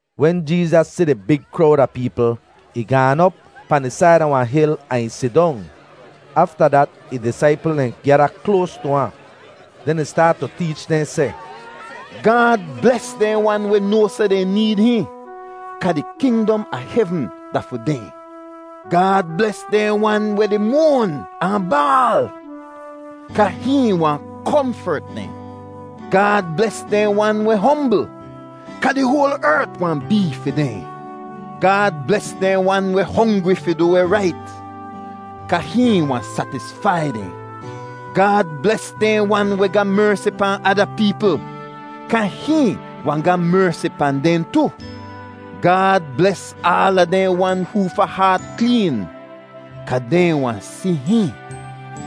Wen Jeezas si di big krowd a peepl, ih gaan op pahn di said a wahn hil ahn ih sidong. Afta dat ih disaipl dehn gyada kloas tu ahn. Den ih staat tu teech dehn seh, “Gaad bles dehn wan weh noa seh dehn need hihn, kaa di kingdom a hevn da fi dehn. Gaad bles dehn wan weh di moan ahn baal, kaa hihn wahn komfert dehn. Gaad bles dehn wan weh hombl, kaa di hoal ert wahn bee fi dehn. Gaad bles dehn wan weh hongri fi du weh rait, kaa hihn wahn satisfai dehn. Gaad bles dehn wan weh ga mersi pahn ada peepl, kaa hihn wahn ga mersi pahn dehn tu. Gaad bles aala dehn wan hoofa haat kleen, kaa dehn wahn si hihn.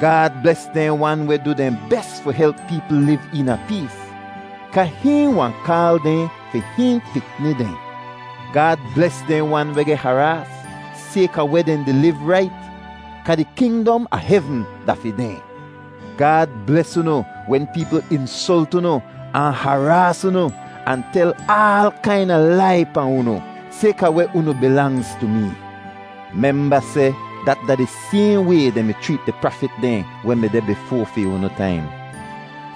Gaad bles dehn wan weh du dehn bes fi help peepl liv eena pees, kaa hihn wahn kaal dehn fi hihn pikni dehn. Gaad bles dehn wan weh geh haraas sayka weh dehn di liv rait, kaa di kingdom a hevn da fi dehn. “Gaad bles unu wen peepl insolt unu ahn haraas unu ahn tel aal kaina lai pahn unu sayka weh unu bilangz tu mee. Memba seh dat da di sayhn way dehn mi chreet di prafit dehn weh mi deh bifoa fi unu taim.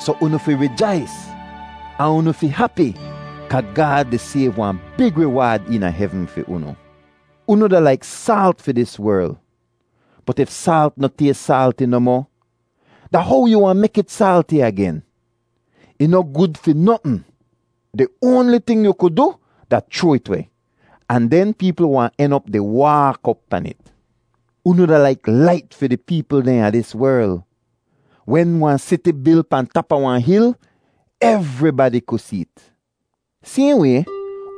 Soh unu fi rijais ahn unu fi hapi, kaa Gaad di sayv wahn big riwaad eena hevn fi unu. “Unu da laik saalt fi dis werl. Bot if saalt noh tays saalti nohmoh, da how yu wahn mek it saalti agen? Ih noh gud fi notn. Di oanli ting yu ku du da chroa it weh, ahn den peepl wahn en op di waak op pan it. “Unu da laik lait fi di peepl dehn a dis werl. Wen wahn siti bil pahn tap a wahn hil, evribadi ku see't. Sayhn way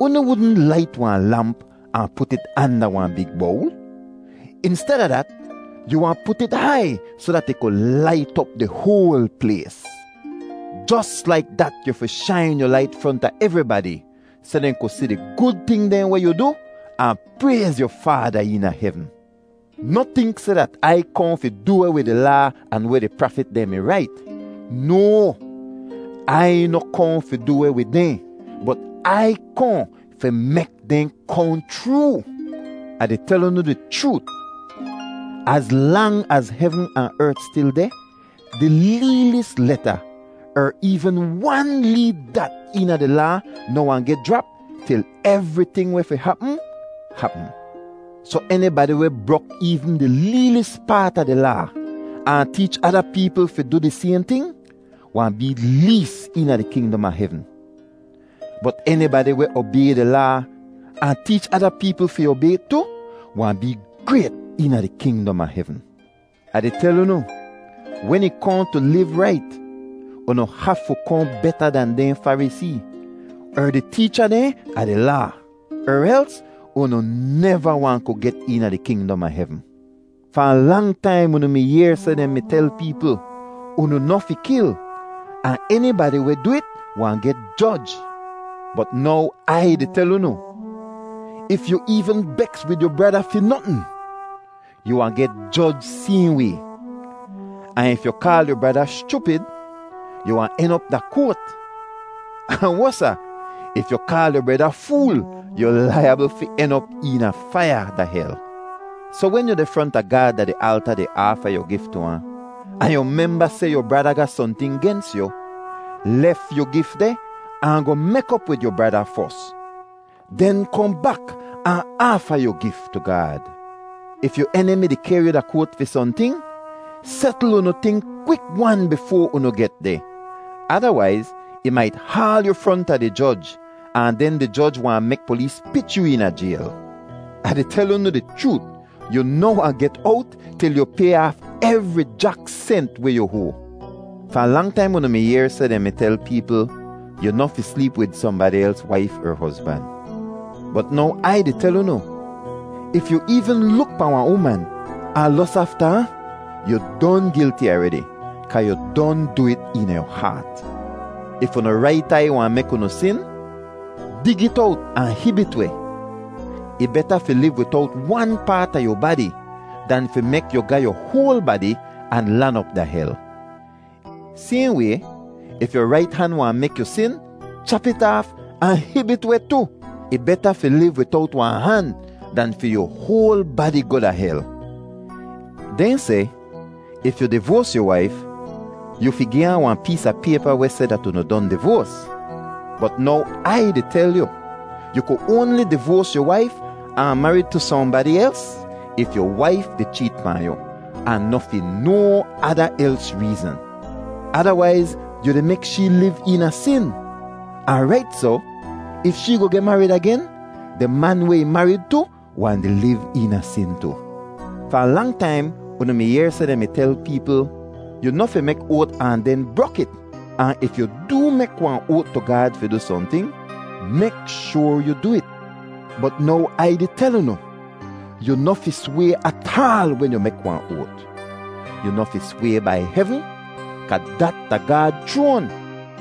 unu wudn lait wahn lamp ahn put it anda wahn big bowl. Insteda dat, yu wahn put it hai soh dat ih ku lait op di hoal plays. Jos laik dat yu fi shain yu lait fronta evribadi, soh dehn ku si di gud ting dehn weh yu du, ahn prayz yu Faada eena hevn. “Noh tink seh dat Ai kohn fi du weh wid di Laa ahn weh di prafit dehn mi rait. No, Ai noh kohn fi du weh wid dehn, bot Ai kohn fi mek dehn kohn chroo. Ah di tel unu di chroot, az lang az hevn ahn ert stil deh, di leelis leta er eevn wan lee dat eena di Laa noh wahn geh jrap til evriting weh fi hapm hapm. Soh enibadi weh brok eevn di leelis paat a di Laa, ahn teech ada peepl fi du di sayhn ting, wahn bee lees eena di kingdom a hevn. Bot enibadi weh obay di Laa, ahn teech ada peepl fi obay it tu, wahn bee grayt eena di kingdom a hevn. Ah di tel unu, wen ih kohn tu liv rait, unu hafu kohn beta dan dehn Farisee er di teecha dehn a di Laa, er els unu neva wahn ku get eena di kingdom a hevn. “Fahn lang taim unu mi yehr seh dehn mi tel peepl, ‘Unu noh fi kil, ahn enibadi weh du it wahn geh joj.’ Bot now Ai di tel unu, if yu eevn beks wid yu brada fi notn, yu wahn geh joj sayhn way. Ahn if yu kaal yu brada, ‘Schupid!’ yu wahn en op da koat. Ahn wosa, if yu kaal yu breda, ‘Fool!’ yu laiyabl fi en op eena faiya da hel. “Soh wen yu deh fronta Gaad da di alta di aafa yu gif tu ahn, ahn yu memba seh yu brada ga sohnting gens yu, lef yu gif deh ahn goh mek op wid yu brada fos. Den kohn bak ahn aafa yu gif tu Gaad. “If yu enimi di kehr yu da koat fi sohnting, setl unu ting kwik-wan bifoa unu get deh. Adawaiz, ih mait haal yu fronta di joj, ahn den di joj wahn mek polees pich yu eena jayl. Ah di tel unu di chroot, yu noh wahn get owt til yu pay aaf evri jak sent weh yu hoa. “Fahn lang taim unu mi yehr seh dehn mi tel peepl, ‘Yu noh fi sleep wid sohnbadi els waif er hozban.’ Bot now Ai di tel unu, if yu eevn luk pahn wahn uman ahn los afta ahn, yu don gilti aredi kaa yu don du it eena yu haat. If unu rait aiy wahn mek unu sin, dig it owt ahn hib it weh. Ih beta fi liv widowt wan paat a yu badi dan fi mek yu ga yu hoal badi ahn lan op da hel. Sayhn way, if yu rait han wahn mek yu sin, chap it aaf ahn hib it weh tu. Ih beta fi liv widowt wahn han dan fi yu hoal badi goh da hel. “Dehn seh, ‘If yu divoas yu waif, yu fi gi ahn wahn pees a paypa weh seh dat unu don divoas.’ Bot now Ai di tel yu, yu ku oanli divoas yu waif ahn marid tu sohnbadi els if yu waif di cheet pahn yu, ahn noh fi no ada els reezn. Adawaiz yu di mek shee liv eena sin, ahn rait soh, if shee goh geh marid agen, di man weh ih marid tu wahn di liv eena sin tu. “Fahn lang taim unu mi yehr seh dehn mi tel peepl, ‘Yu noh fi mek oat ahn den brok it; ahn if yu doo mek wahn oat tu Gaad fi du sohnting, mek shoar yu du it.’ Bot now Ai di tel unu, yu noh fi sway ataal wen yu mek wahn oat. Yu noh fi sway bai hevn kaa dat da Gaad chroan,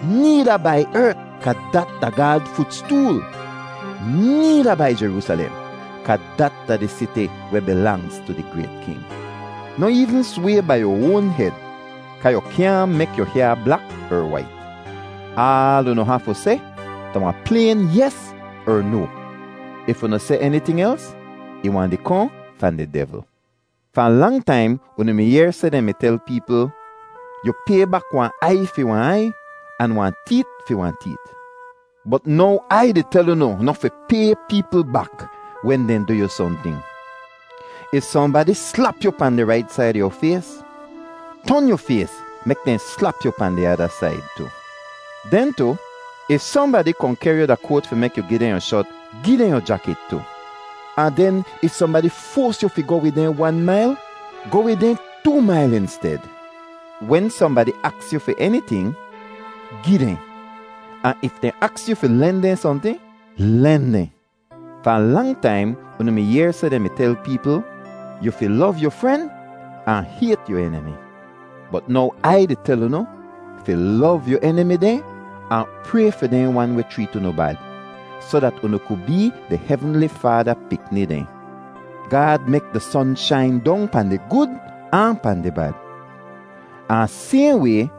needa bai ert, kaa dat da Gaad futstool, needa bai Jeroosalem, kaa dat da di siti weh bilangz tu di grayt King. Noh eevn sway bai yu oan hed kaa yu kyaahn mek yu hyaa blak er wait. Aal unu hafu seh da wahn playn ‘yes’ er ‘no.’ If unu seh eniting els, ih wahn di kohn fahn di devl. “Fahn lang taim unu mi yehr seh dehn mi tel peepl, ‘Yu pay bak wahn aiy fi wahn aiy ahn wahn teet fi wahn teet.’ Bot now Ai di tel unu noh fi pay peepl bak wen dehn du yu sohnting. If sohnbadi slap yu pahn di rait said a yu fays, ton yu fays mek dehn slap yu pahn di ada said tu. Den tu, if sohnbadi kohn kehr yu da koat fi mek yu gi dehn yu shot, gi dehn yu jakit tu. Ahn den if sohnbadi foas yu fi goh wid dehn wan mail, goh wid dehn too mail insted. Wen sohnbadi aks yu fi eniting, gi dehn, ahn if dehn aks yu fi len dehn sohnting, len dehn. “Fahn lang taim unu mi yehr seh dehn mi tel peepl, ‘Yu fi lov yu fren ahn hayt yu enimi.’ Bot now Ai di tel unu fi lov yu enimi dehn ahn pray fi dehn wan weh chreet unu bad, soh dat unu ku bee di hevnli Faada pikni dehn. Gaad mek di son shain dong pahn di gud ahn pahn di bad, ahn sayhn way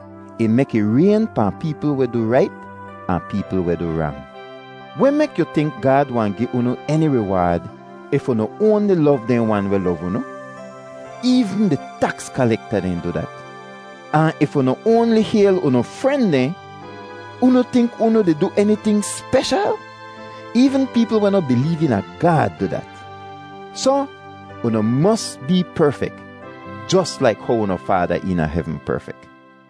ih mek ih rayn pahn peepl weh du rait ahn peepl weh du rang. Weh mek yu tink Gaad wahn gi unu eni riwaad if unu oanli lov dehn wan weh lov unu? Eevn di taks kalekta dehn du dat! Ahn if unu oanli hayl unu fren dehn, unu tink unu di du eniting speshal? Eevn peepl weh noh bileev eena Gaad du dat! Soh unu mos bee perfek jos laik how unu Faada eena hevn perfek.